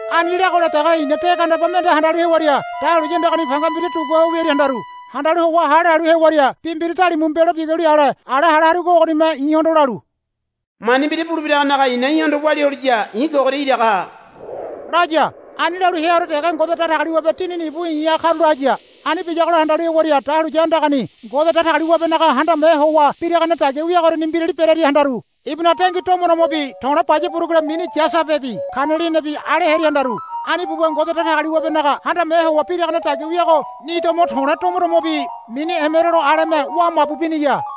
Ani leagola dege i̱na de gandeba mende handalu hewaria dahuliya andagani panga mbira dugua ho wiaria handaru. Handalu howa hale halu hewaria bi mbira dalimu mbelo biguli ale ala hale harugo bi ogonime i̱hondo lalu, Mani mbira bulebiragonaga i̱na í̠hondo walia holiya i̱ kogoria iraga ha, laya. Ani lalu heaore dege Ngode Datagaliwabe Dinini ibu i̱ha karula haya. Ani biyagola handalu hewaria dahuliya andagani Ngode Datagaliwabenaga handame howa biragane dagia wiagoriani mbirali berearia handaru. Ibunaga dengui domodomobi to̱le̱ baya burugule mini yasabebi kanelianibi ale hearia handaru. Ani buwa Ngode Datagaliwabenaga handame howa biragane dagia wiago ni domo to̱le̱ domo domobi mini emerolo aleme wa mabu biniya.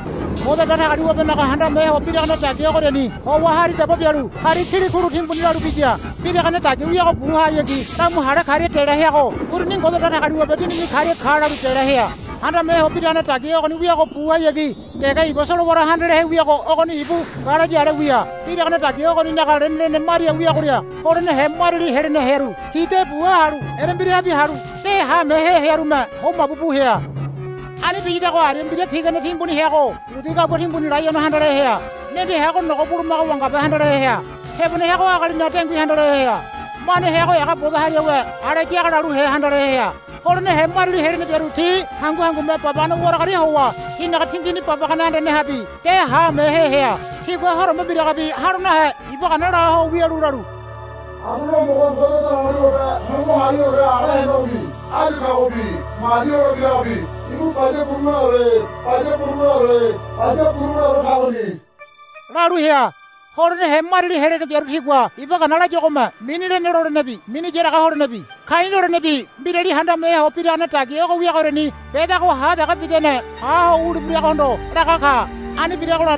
Ngode Datagaliwabenaga handame ho biragane dagia ogoriani howa hari daba bialu hari kilikulu timbuni lalu biya. Biragane dagia wiago buhayagi lamu hale karia dela heago uruni Ngode Datagaliwabe Dinini karia ka lalu dela hea. Handame ho biragane dagia ogoni wiago buhayagi dege iba solowara handalehe wiago ogoni ibu ngalayi ale wia. Biragane dagia ogonaga lenelene maria wiagoria holenehe mariali helene hearu ti de buha halu erembirahabi halu de haamehe hearume ho mabu bu hea. Ani biyadago aria mbira pigane timbuni heago budi gabua timbuni laiono handalehe hea. Mende heago nogo bulumaga wangabe handalehe hea. Tebone heago agalinaga dengui handalehe hea. Mane heago ega bodo hariawe ale yaga laluhe handalehe hea. Holenehe mariali helene biaru ti hangu hangume babagane waragaria howa tinaga tingini babagane andanehabe de haamehe hea. Tigua horombe mbiragabi ha̱lo nahe iba gana la ho wialu lalu, Anduane Homogo Ngode Datagaliwabe Hongo Haiheore ala henegobi áyu kagobi mani holebiragobi ibu baya buruguleore baya buruguleore baya buruguleore kagoni, lalu hea. Holenehe mariali helene biaru tigua iba gana layuagome mini lene lolenebi mini yaraga holenebi ka̱i̱ lolenebi mbirali handame ho biragane dagia ogo wiagoriani bedago ha dege bidane ha ho wulebiragohondo laga ka. Ani biragola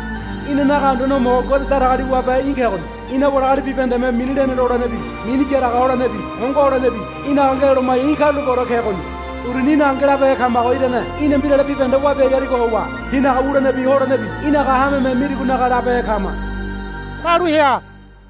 Inanaga Anduane Homogo Ngode Datagaliwabe í̠ kegoni. Ina wali agali bibahendeme mini lene lolenebi mini yaraga holenebi hongo holenebi í̠naga ngeloloma̱ya í̠ karulapeore kegoni. Uruni í̠naga ngelabehe kamago irane í̠na mbirale bibahende wabiai harigo howa tinaga wulenebi holenebi í̠naga hameme mirigonaga labehe kama, lalu hea.